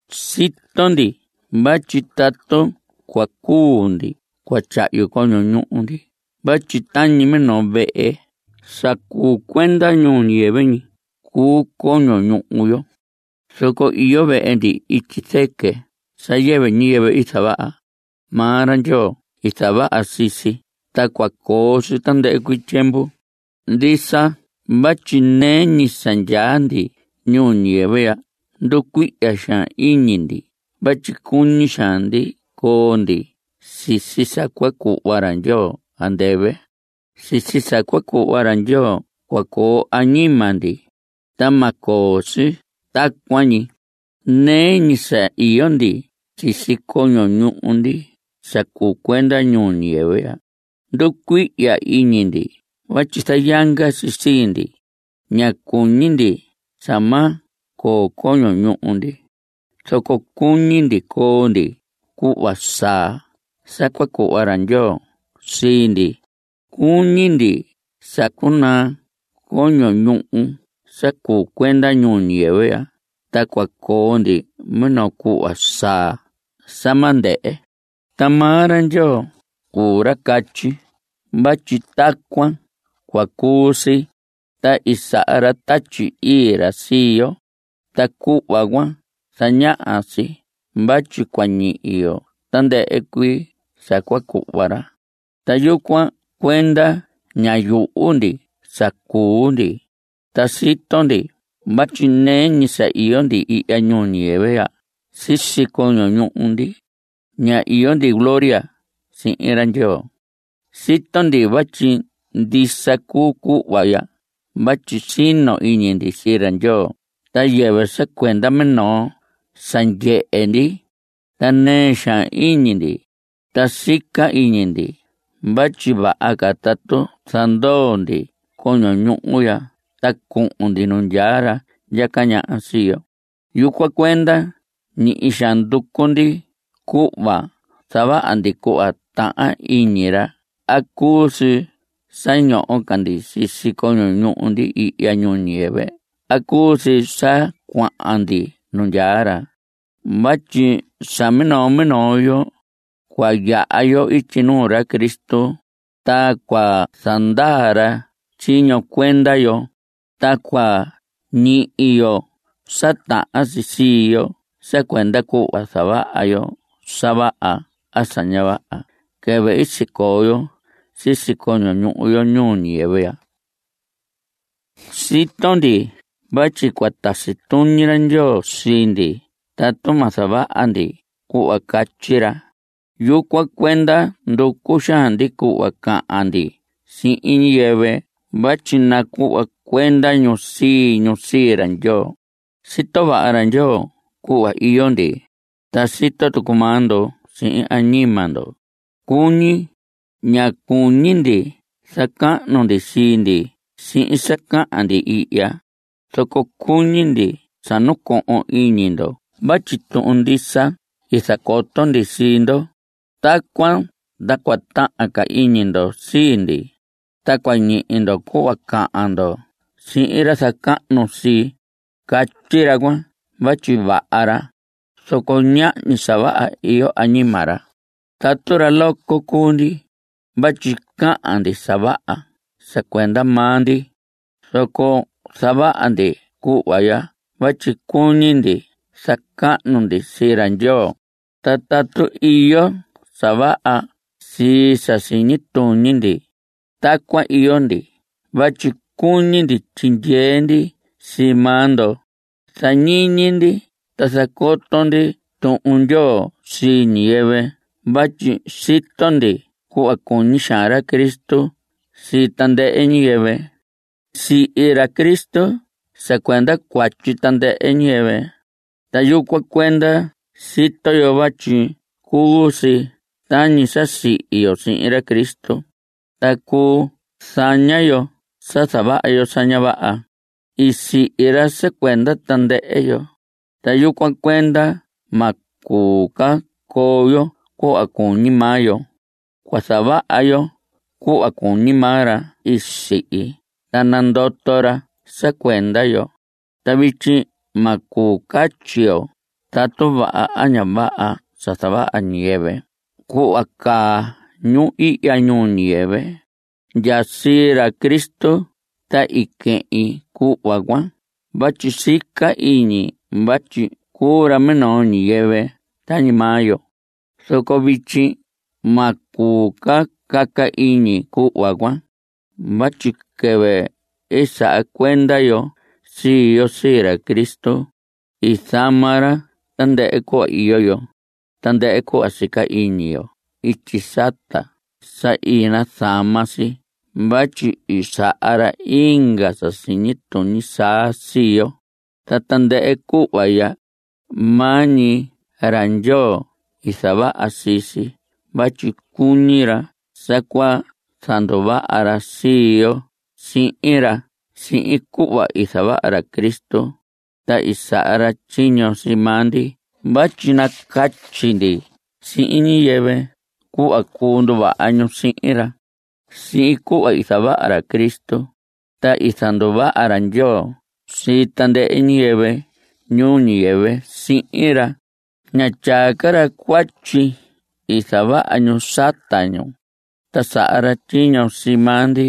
Sito ndi vatyi tatu cua cuu ndi cua tyahyu coño ñuhu ndi vatyi tañi minoo vehe sa cuu cuenda ñuu ñiyɨvɨ ñi cuu coño ñuhu yo. Zoco iyo vehe ndi ityi zɨquɨ sa yɨvɨ ñiyɨvɨ i zavaha. Maa ra Ndyoo i zavaha sii si, ta cua coo si tandɨhɨ cuii tyiemvu. Ndisa vatyi nɨɨ ñi sa ndyaa ndi ñuu ñiyɨvɨ ya nducuihya xaan iñi ndi vatyi cuñi xaan ndi coo ndi sisi sa cua cuhva ra Ndyoo andɨvɨ. Sisi sa cua cuhva ra Ndyoo cua coo añima ndi, ta ma coo si tacuan ñi. Nɨɨ ñi sa iyo ndi sisi coño ñuhu ndi sa cuu cuenda ñuu ñiyɨvɨ ya, nducuihya iñi ndi vatyi zayanga si sii ndi. Ña cuñi ndi sa ma coo coño ñuhu ndi, zoco cuñi ndi coo ndi cuhva saa sa cua cuhva ra Ndyoo sii ndi. Cuñi ndi sa cunaa coño ñuhu sa cuu cuenda ñuu ñiyɨvɨ ya ta cua coo ndi minoo cuhva saa sa ma ndɨhɨ. Ta maa ra Ndyoo cuu ra catyi vatyi tacuan cua cuu si, ta i saha ra Tatyi Ii ra sii yo. Ta cuhva cuan zañaha si vatyi cua ñihi yo tandɨhɨ cuii sa cua cuhva ra. Ta yucuan cuenda ña yuhu ndi sa cuu ndi. Ta sito ndi vatyi nɨɨ ñi sa iyo ndi ihya ñuu ñiyɨvɨ ya sisi coño ñuhu ndi, ña iyo ndi gloria sihin ra Ndyoo. Sito ndi vatyi ndisa cuu cuhva ya vatyi sino iñi ndi sii ra Ndyoo ta yɨvɨ sa cuenda minoo sa ndyehe ndi. Ta nɨɨ xaan iñi ndi, ta sica iñi ndi vatyi vaha ca tatu zandoo ndi coño ñuhu ya ta cuhun ndi nu ndyaa ra ndyaca ñaha sii yo. Yucuan cuenda ñihi xaan nducu ndi cuhva zavaha ndi cuhva tahan iñi ra a cuu si sa ñoho ca ndi sisi coño ñuhu ndi ihya ñuu ñiyɨvɨ a cuu si sa cuahan ndi nu ndyaa ra. Vatyi sa minoo minoo yo cua yaha yo ityi nuu ra Cristo, ta cua zandaa ra tyiño cuenda yo, ta cua ñihi yo sa tahan si sii yo sa cuenda cuhva i zavaha yo sa vaha a sa ña vaha quɨvɨ i sicoo yo sisi coño ñuhu yo ñuu ñiyɨvɨ ya. Sito ndi vatyi cua tasi tuñi ra Ndyoo sii ndi tatu ma zavaha ndi cuhva catyi ra. Yucuan cuenda nducu xaan ndi cuhva cahan ndi sihin ñiyɨvɨ vatyi nacuhva cuenda ñu sii ñu sii ra Ndyoo. Sito vaha ra Ndyoo cuhva iyo ndi, ta sito tucu maa ndo sihin añima ndo, cuñi. Ña cuñi ndi zacahnu ndi sii ndi sihin sa cahan ndi ihya, zoco cuñi ndi sa nacohon iñi ndo vatyi tuhun ndisa i zacoto ndi sii ndo. Tacuan ta cua tahan ca iñi ndo sii ndi. Ta cua ñihi ndo cuhva cahan ndo sihin ra zacahnu sii. Catyi ra cuan vatyi vaha ra, zoco ñahñi sa vaha iyo añima ra. Tatu ra loco cuu ndi (vatyi cahan ndi sa vaha sa cuenda maa ndi), zoco zavaha ndi cuhva ya vatyi cuñi ndi zacahnu ndi sii ra Ndyoo. Ta tatu iyo sa vaha sii sa siñi tuñi ndi, tacuan iyo ndi vatyi cuñi ndi tyindyee ndi sii maa ndo. Zañiñi ndi ta zacoto ndi Tuhun Ndyoo sii ñiyɨvɨ vatyi sito ndi cuhva cuñi xaan ra Cristo sii tandɨhɨ ñiyɨvɨ. Sihi ra Cristo sa cuenda cuatyi tandɨhɨ ñiyɨvɨ, ta yucuan cuenda sito yo vatyi cuu si tañi sa sihi yo sihin ra Cristo, ta cuu zaña yo sa zavaha yo sa ña vaha. I sihi ra sa cuenda tandɨhɨ yo, ta yucuan cuenda ma cuu ca coo yo cuhva cuñi maa yo. Cua zavaha yo cuhva cuñi maa ra i sihi ta nandoto ra sa cuenda yo. Ta vityi ma cuu catyi yo tatu vaha a ña vaha sa zavaha ñiyɨvɨ cuhva caa ñu ihya ñuu ñiyɨvɨ. Ndya sii ra Cristo ta i quehin cuhva cuan vatyi sica iñi vatyi cuu ra minoo ñiyɨvɨ tañi maa yo, zoco vityi ma cuu ca caca iñi cuhva cuan. Vatyi quɨvɨ saha cuenda yo sii yo sii ra Cristo, i zama ra tandɨhɨ cuhva iyo yo. Tandɨhɨ cuhva i sica iñi yo ityi sata sa i nazama si vatyi i saha ra inga sa siñi tuñi saa sii yo. Ta tandɨhɨ cuhva ya, maa ñi ra Ndyoo i zavaha sii si vatyi cuñi ra sa cua zanduvaha ra sii yo sihin ra sihin cuhva i zavaha ra Cristo. Ta i saha ra tyiño sii maa ndi vatyi nacatyi ndi sihin ñiyɨvɨ cuhva cuu nduvaha ñu sihin ra. Sihin cuhva i zavaha ra Cristo, ta i zanduvaha ra Ndyoo sii tandɨhɨ ñiyɨvɨ ñuu ñiyɨvɨ sihin ra. Ña tyaa ca ra cuatyi i zavaha ñu sata ñu. Ta saha ra tyiño sii maa ndi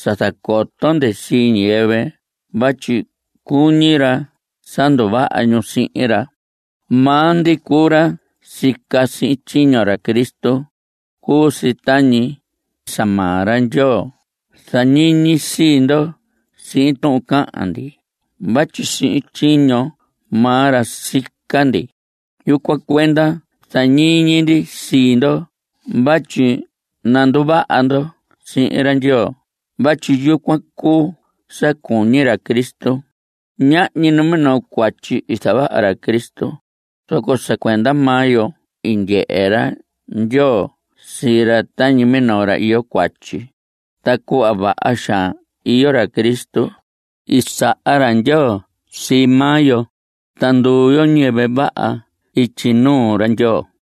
sa zacoto ndi sii ñiyɨvɨ vatyi cuñi ra sa nduvaha ñu sihin ra. Maa ndi cuu ra sica sihin tyiño ra Cristo. Cuu si tañi sa maa ra Ndyoo zañiñi sii ndo sihin tuhun cahan ndi vatyi sihin tyiño maa ra sica ndi. Yucuan cuenda zañiñi ndi sii ndo vatyi nanduvaha ndo sihin ra Ndyoo vatyi yucuan cuu sa cuñi ra Cristo. Ñahñi numinoo cuatyi i zavaha ra Cristo, zoco sa cuenda maa yo i ndyehe ra Ndyoo sii ra tañi minoo ra iyo cuatyi. Ta cuhva vaha xaan iyo ra Cristo, i saha ra Ndyoo sii maa yo, ta nduu yo ñiyɨvɨ vaha ityi nuu ra Ndyoo.